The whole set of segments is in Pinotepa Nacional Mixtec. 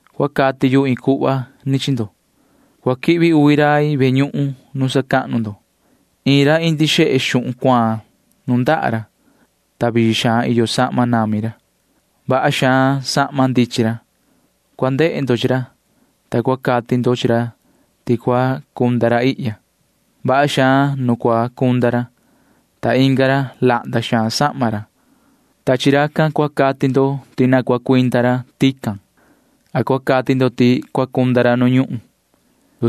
Cua cati main iin cuhva chi ndo. Cua quihvi uvi rai ve ñuhun nu sacahnu ndo. Iin ra indi xehe xuhun cuaan nundaha ra, ta vii xaan iyo sahma nami ra. Vaha xaan sahma ndichin ra. Cua ndehe ndo chi ra, ta cua cati ndo chi ra ti cua cunda ra ihya. Vaha xaan nu cua cunda ra, ta inga ra―lahnda xaan sahma ra. Chi maan ra cua cati ndo ti cua cuinda maan ra tican, a cua cati ndo ti cua cunda ra ihya nu ñuhun, cua cati ndo.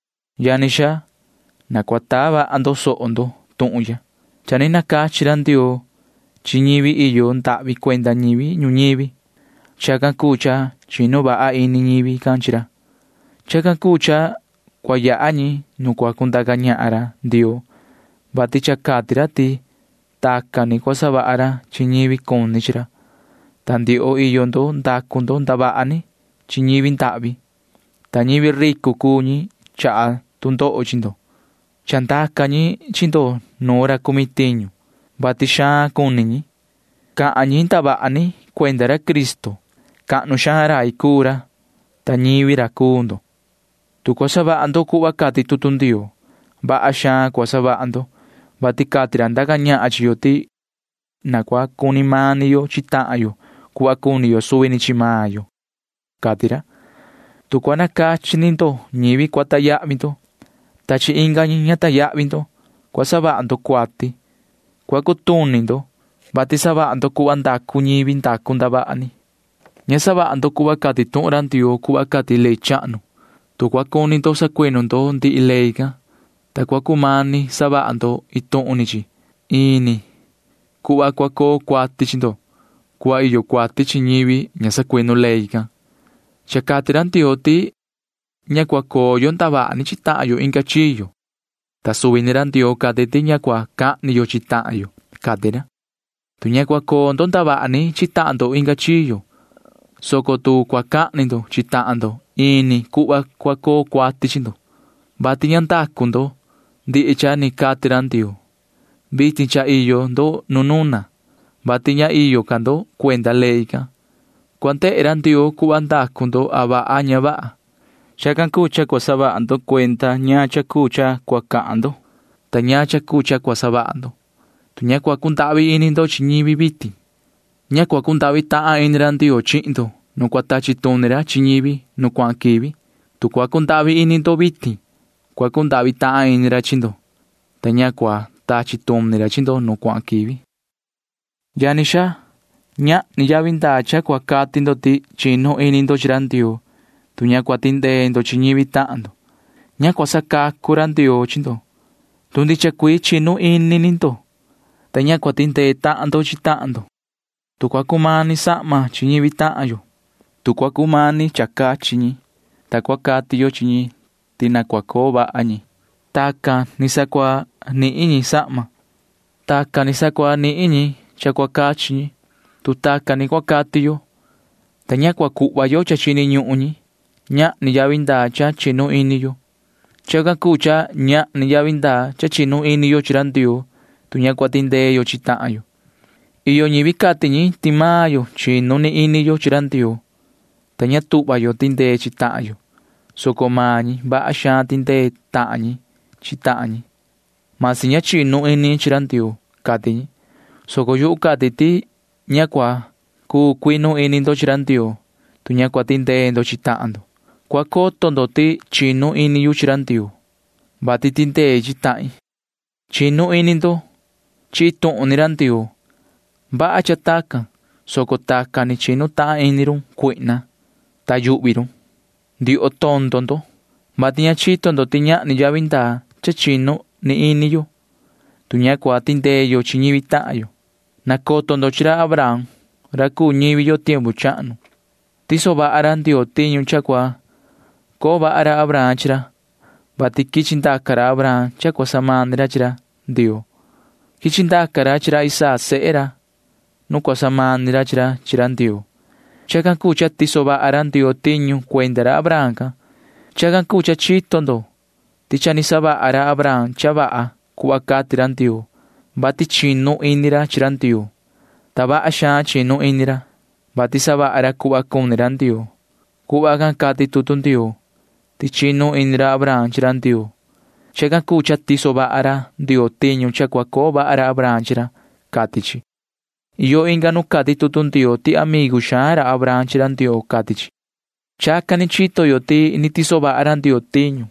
Yani xaa, na cua taa vaha ndo soho ndo tuhun ya. Cha ni nacachi ra Ndioo chi ñivi iyo ndahvi cuenda ñivi ñuñivi. Chacan cuu cha chinu vaha ini ñivi can chi ra. Chacan cuu cha cua yaha ñi nu cua cundaca ñahan ra Ndioo, vati cha cati ra ti tacan ni cua savaha ra chi ñivi cuni chi ra, ta ndioho iyo ndo ndacu ndo ndavaha ni chi ñivi ndahvi, ta ñivi ricu cuu ñi chaha tu ndoho chi ndo. Chandaca ñi chi ndo nuun ra cumi tiñu, vati xaan cuni ñi. Cha cahan ñi ndavaha ni cuenda ra Cristo. Cahnu xaan rai cuu ra, ta ñivi ra cuu ndo. Tu cua savaha ndo cuhva cati tutu Ndioo, vaha xaan cua savaha ndo, vati cati ra ndaca ñahan chi yo ti na cua cuni mani yo chi tahan yo cuhva cuni yo suvi ni chi maan yo, cati ra. Tu cua nanducu ndo yoo ñivi cua sacahnu ndo, ta ña cua sacahnu ndo chi ndihi ñivi, cua savaha ndo cuati. Cua cutuni ndo, vati savaha ndo cuhva ndacu ñivi ndacu ndavaha ni. Ña savaha ndo cuhva cati tuhun ra Ndioo cuhva cati ley chahnu. Tu cua cuni sacuinu ndo ndihi ley can, soco cua cumani savaha ndo iin tuhun ni chi, ini cuhva cua coo cuati chi ndo cuhva iyo cuati chi ñivi ña sacuinu ndee ini ley can. Cha cati ra Ndioo ti ña cua coo yo ndavaha ni chi tahan yo inga chiyo, ta suvi ni ra Ndioo cati ti ña cua cahni yo chi tahan yo, cati ra. Tu ña cua coo ndo ndavaha ni chi tahan ndo inga chiyo, soco cua cahni ndo chi tahan ndo, ini cuhva cua coo cuati chi ndo, vati ña savaha ndo ndihi cha ni cati ra Ndioo. Vitin cha iyo ndo nu nuna, vati ña iyo ca ndo cuenda ley can. Cua ndehe ra Ndioo cuhva ndacu ndo a vaha a ña vaha. Chacan cuu cha cua saha vaha ndo cuenda ñaan cha cuu cha cua cahan ndo ta ñaan cha cuu cha cua savaha ndo. Tu ña cua cundahvi ini ndo chi ñivi vitin, ña cua cundahvi ini ra Ndioo chi maan ndo nu cua tachi tuni ra chi ñivi nu cuahan quivi. Tu cua cundahvi ini ndo vitin, cua cundahvi tahan ini ra chi ndo, ta ña cua tachi tuni ra chi ndo nu cuahan quivi. Yani xaa, ñahni yavi ndaa cha cua cati ndo ti chinu ini ndo chi ra Ndioo, tu ña cua tindee ndo chi ñivi tahan ndo. Ña cua sacacu ra Ndioo chi ndo, tu cua cuinu ni ini ndo, ta ña cua tindee tahan ndo chi tahan ndo. Tu cua cumani sahma chi ñivi tahan yo, tu cua cumani cha cachi ñi, ta cua cati yo chi ñi ti na cua coo vaha ñi. Tacan ni sa cua nihin ñi sahma. Tacan ni sa cua nihin ñi cha cua cachi ñi, tu tacan ni cua cati yo, ta ña cua cuhva yo cha chini ñuhun ñi, ñahni yavi ndaa cha chinu ini yo. Chacan cuu cha ñahni yavi ndaa cha chinu ini yo chi ra Ndioo, tu ña cua tindee tahan yo chi tahan yo. Iyo ñivi cati ñi ti maan yo chinu ni ini yo chi ra Ndioo, ta ña tuhva yo tindee yo chi tahan yo, soco maan ñi vaha xaan tindee tahan ñi chi tahan ñi, masi ña chinu ini ñi chi ra Ndioo, cati ñi, soco yuhu cati ti ña cua cuu cuinu ini ndo chi ra Ndioo, tu ña cua tindee ndo chi tahan ndo. Cua coto ndo ti chinu ini yu chi ra Ndioo, vati tindei chi tahin. Chinu ini ndo ti iin tuhun ni ra Ndioo iyo. Vaha cha tacan, soco tacan ni chinu tahan ini run cuihna, ta yuhvi run. Ndioho tondo ndo, vati ña chito ndo ti ñahni yavi ndaa cha chinu ni ini yo, tu ña cua tindee tahan yo chi ñivi tahan yo. Nacoto ndo chi ra Abraham ra cuu ñivi yo tiempu chahnu. Tiso vaha ra Ndioo tiñu cha cua coo vaha ra Abraham chi ra, vati quichi ndaca Abraham cha cua samani ra chi ra Ndioo. Quichi ndaca ra chi ra Isaac sehe ra nu cua samani ra chi ra chi ra Ndioo. Chacan cuu cha tiso vaha ra Ndioo tiñu cuenda ra Abraham can. Chacan cuu cha chito ndo ti cha ni savaha ra Abraham cha vaha cuhva cati ra Ndioo, vati chinu ini ra chi ra Ndioo. Ta ni cuhva vaha xaan ca chinu ini ra, vati cha savaha ra cuhva cuni ra Ndioo. Tacan ndicha cuhva cati tutu Ndioo ti chinu ini ra Abraham chi ra Ndioo. Chacan cuu cha tiso vaha ra Ndioo tiñu cha cua coo vaha Abraham chi ra, cati chi. Iyo inga nu cati tutu Ndioo ti amigu xaan ra Abraham chi ra Ndioo, cati chi. Chacan ni chito yo ti ni tiso vaha ra Ndioo tiñu,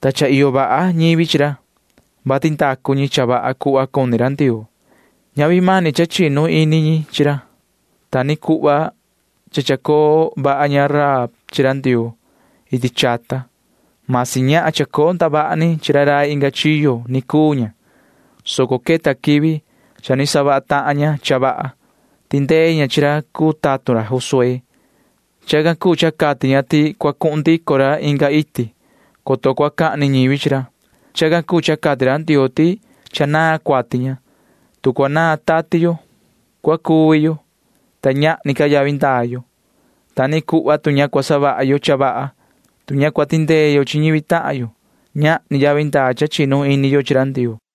ta cha iyo vaha ñivi chi ra, vati ndacu ñi cha vaha cuhva cuni ra Ndioo. Ñavi mani cha chinu ini ñi chi ra. Ta ni cuhva cha ni chacoo vaha ña Rahab chi ra Ndioo iti chata. Cha chacoo tahan ña ndavaha ni chi ra rai inga chiyo, soco queta quivi cha ni savaha tahan ña cha vaha. Tindee ña chi ra cuu tatun ra Josué. Chacan cuu cha cati ña ti cua cuhun ndico ra inga iti, coto cua cahni ñivi chi ra. Chacan cuu cha cati ra Ndioo ti cha naan cuati ña. Tu cua naan tati yo, cua cuvi yo, ta ñahni ca yavi ndaa yo. Ta ni cuhva tu ña cua savaha yo cha vaha, tu ña cua tindee yo chi ñivi tahan yo, ñahni yavi ndaa cha chinu ini yo chi ra Ndioo.